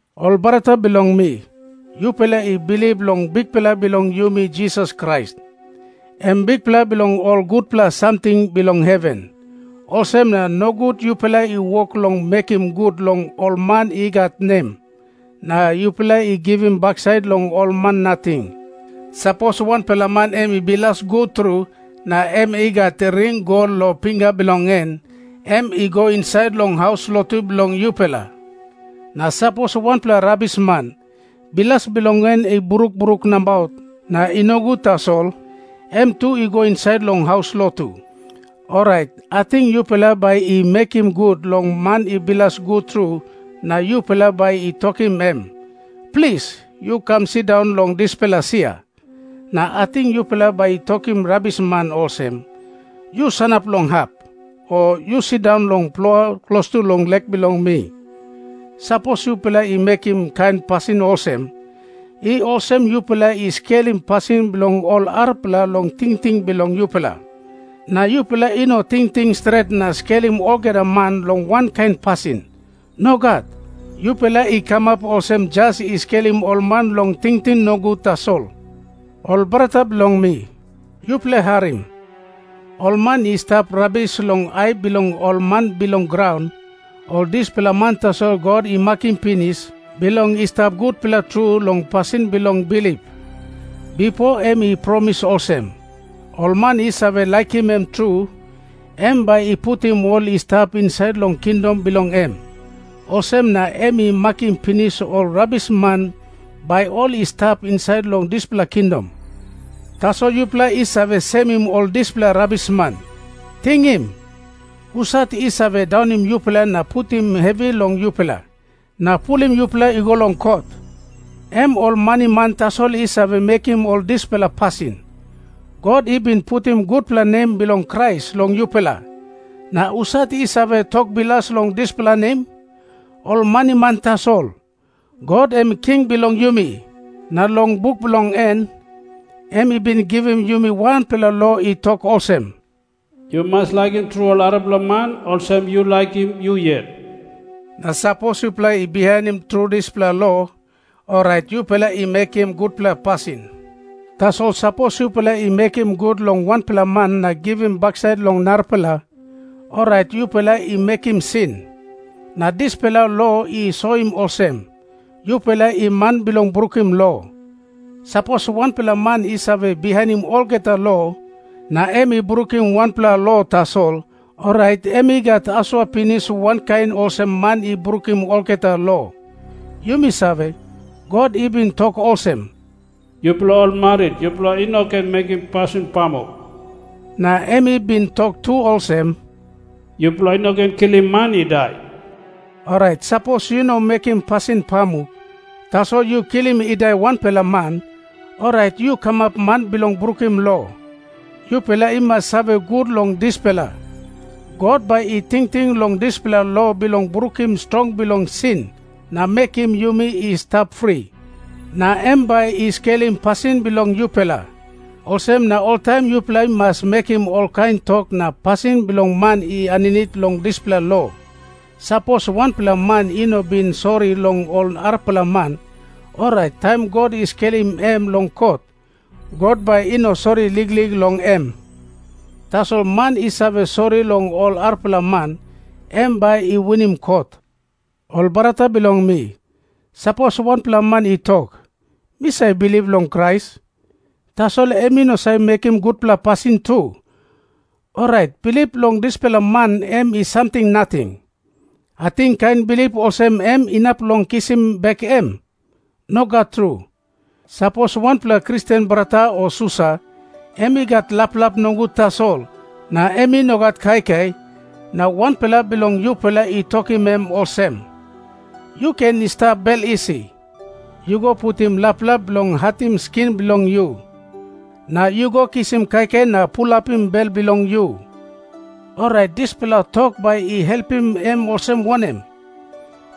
Ol brata bilong mi, yupela i bilip long Bikpela bilong yumi Jisas Krais, em Bikpela bilong ol gutpela samting bilong heven. Olsem na nogut yupela i wok long mekim gut long ol man i gat nem, na yupela i givim baksait long ol man nating. Sapos wanpela man em i bilas gut tru na em i gat ring gol long pinga bilong en, em i go insait long haus lotu bilong yupela. Na sapos wanpela rabisman, bilas bilong en i bruk bruk nabaut na i nogut tasol, em tu i go insait long haus lotu. Orait ating yupela bai i mekim gut long man i bilas gut tru na yupela bai i tokim em, “Plis, yu kam sindaun long dispela sia.” Na ating yupela bai i tokim rabisman olsem, “Yu sanap long hap,” o, “Yu sindaun long plua klostu long lek bilong mi.” Sapos yupela i mekim kain pasin olsem, i olsem yupela i skelim pasin bilong ol arapela long tingting bilong yupela. Na yupela i no tingting stret na skelim olgeta man long wankain pasin. Nogat. Yupela i kamap olsem jas i skelim ol man long tingting nogut tasol. Ol brata bilong mi, yupela harim. Ol man i stap rabis long ai bilong ol man bilong graun, ol dispela man tasol God i makim pinis bilong i stap gutpela tru long pasin bilong bilip. Bipo em i promis olsem, ol man i save laikim em tru, em bai i putim ol i stap insait long kingdom bilong em. Olsem na em i makim pinis ol rabisman bai ol i stap insait long dispela kingdom. Tasol yupela i save semim ol dispela rabisman. Tingim. Husat i save daunim yupela na putim hevi long yupela, na pulim yupela i go long kot? Em ol maniman tasol i save mekim ol dispela pasin. God i bin putim gutpela nem bilong Krais long yupela, na husat i save tok bilas long dispela nem? Ol maniman tasol. God em i king bilong yumi, na long buk bilong en em i bin givim yumi wanpela lo i tok olsem, “Yu mas laikim tru ol arapela man olsem yu laikim yu yet.” Na sapos yupela i bihainim tru dispela lo, orait yupela i mekim gutpela pasin. Tasol sapos yupela i mekim gut long wanpela man na givim baksait long narapela, orait yupela i mekim sin. Na dispela lo i soim olsem, yupela i man bilong brukim lo. Sapos wanpela man i save bihainim olgeta lo, na em i brukim wanpela lo tasol, orait em i gat asua pinis wankain olsem man i brukim olgeta lo. Yumi save, God i bin tok olsem, “Yupela ol marit, yupela i no ken mekim pasin pamuk.” Na em i bin tok tu olsem, “Yupela i no ken kilim man i dai.” Orait sapos yu no mekim pasin pamuk, tasol yu kilim i dai wanpela man, orait yu kamap man bilong brukim lo. Yupela i mas save gut long dispela. God bai i tingting long dispela lo bilong brukim strong bilong sin na mekim yumi i stap fri, na em bai i skelim pasin bilong yupela. Olsem na oltaim yupela i mas mekim olkain tok na pasin bilong man i aninit long dispela lo. Sapos wanpela man i no bin sori long ol arapela man, orait taim God i skelim em long kot, God bai i no sori liklik long em. Tasol man i save sori long ol arapela man, em bai i winim kot. Ol brata bilong mi, sapos wanpela man i tok, “Mi save bilip long Krais,” tasol em i no save mekim gutpela pasin tu, orait bilip bilong dispela man em i samting nating. Ating kain bilip olsem em inap long kisim bek em? Nogat tru. Sapos wanpela Kristen brata o susa, em i gat laplap nogut tasol, na em i no gat kaikai, na wanpela bilong yupela i tokim em olsem, “Yu ken i stap bel isi. Yu go putim laplap bilong hatim skin bilong yu, na yu go kisim kaikai na pulapim bel bilong yu,” orait dispela tok bai i helpim em olsem wanem?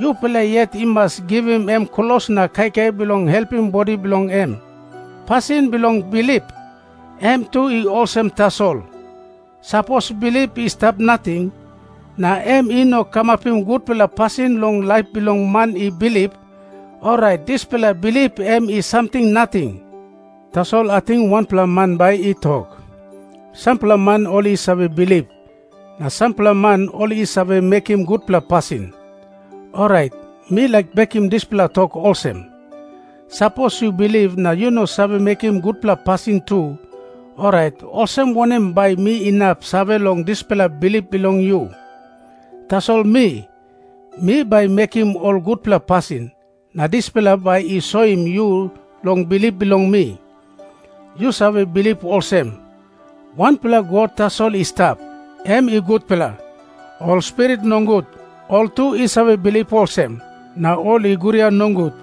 Yupela yet i mas givim em klos na kaikai bilong helpim bodi bilong em. Pasin bilong bilip, em tu i olsem tasol. Sapos bilip i stap nating, na em i no kamapim gutpela pasin long laip bilong man i bilip, orait dispela bilip em i samting nating. Tasol ating wanpela man bai i tok, “Sampela man ol i save bilip, na sampela man ol i save mekim gutpela pasin.” Orait mi laik bekim dispela tok olsem, “Sapos yu bilip na yu no save mekim gutpela pasin tu, orait olsem wanem bai mi inap save long dispela bilip bilong yu? Tasol mi, mi bai mekim ol gutpela pasin, na dispela bai i soim yu long bilip bilong mi.” Yu save bilip olsem, “Wanpela God tasol i stap.” Em i gutpela. Ol spirit nogut ol tu i save bilip olsem, na ol i guria nogut.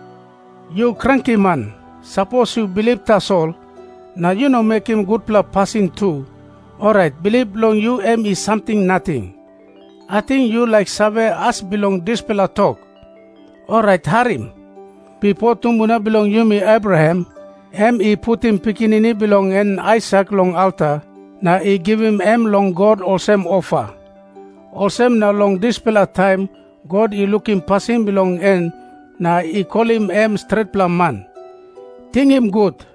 Yu krankiman, sapos yu bilip tasol, na yu no mekim gutpela pasin tu, orait bilip bilong yu em i samting nating. Ating yu laik save as bilong dispela tok? Orait harim. Bipo tumbuna bilong yumi Abraham em i putim pikinini bilong en Aisak long alta na i givim em long God olsem ofa. Olsem na long dispela taim God i lukim pasin bilong en na i kolim em stretpela man. Tingim gut.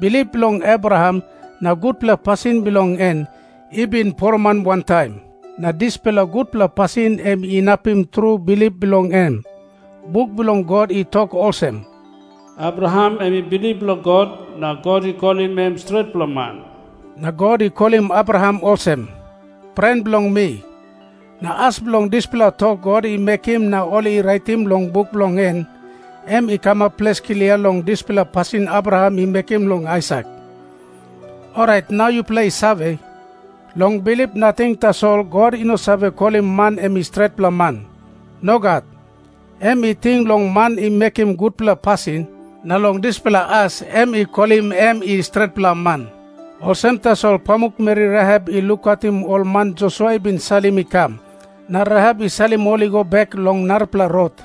Bilip bilong Abraham na gutpela pasin bilong en i bin poroman wantaim, na dispela gutpela pasin em inapim tru bilip bilong em. Buk bilong God i tok olsem, “Abraham em i bilip long God, na God i kolim em stretpela man.” Na God i kolim Abraham olsem, “Pren bilong mi.” Na as bilong dispela tok God i mekim na ol i raitim long buk bilong en, em i kamap ples klia long dispela pasin Abraham i mekim long Aisak. Orait nau yupela i save, long bilip nating tasol God i no save kolim man em i stretpela man. Nogat. Em i ting long man i mekim gutpela pasin, na long dispela as em i kolim em i stretpela man. Olsem tasol pamukmeri Rahap i lukautim ol man Josua i bin salim i kam na Rahap i salim ol i go bek long narapela rot.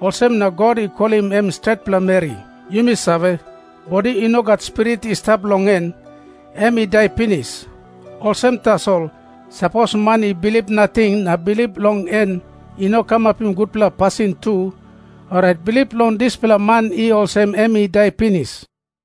Olsem na God i kolim em stretpela meri. Yumi save, bodi i no gat spirit i stap long en, em i dai pinis. Olsem tasol, sapos man i bilip nating na bilip bilong en i no kamapim gutpela pasin tu, orait bilip bilong dispela man i olsem em i dai pinis.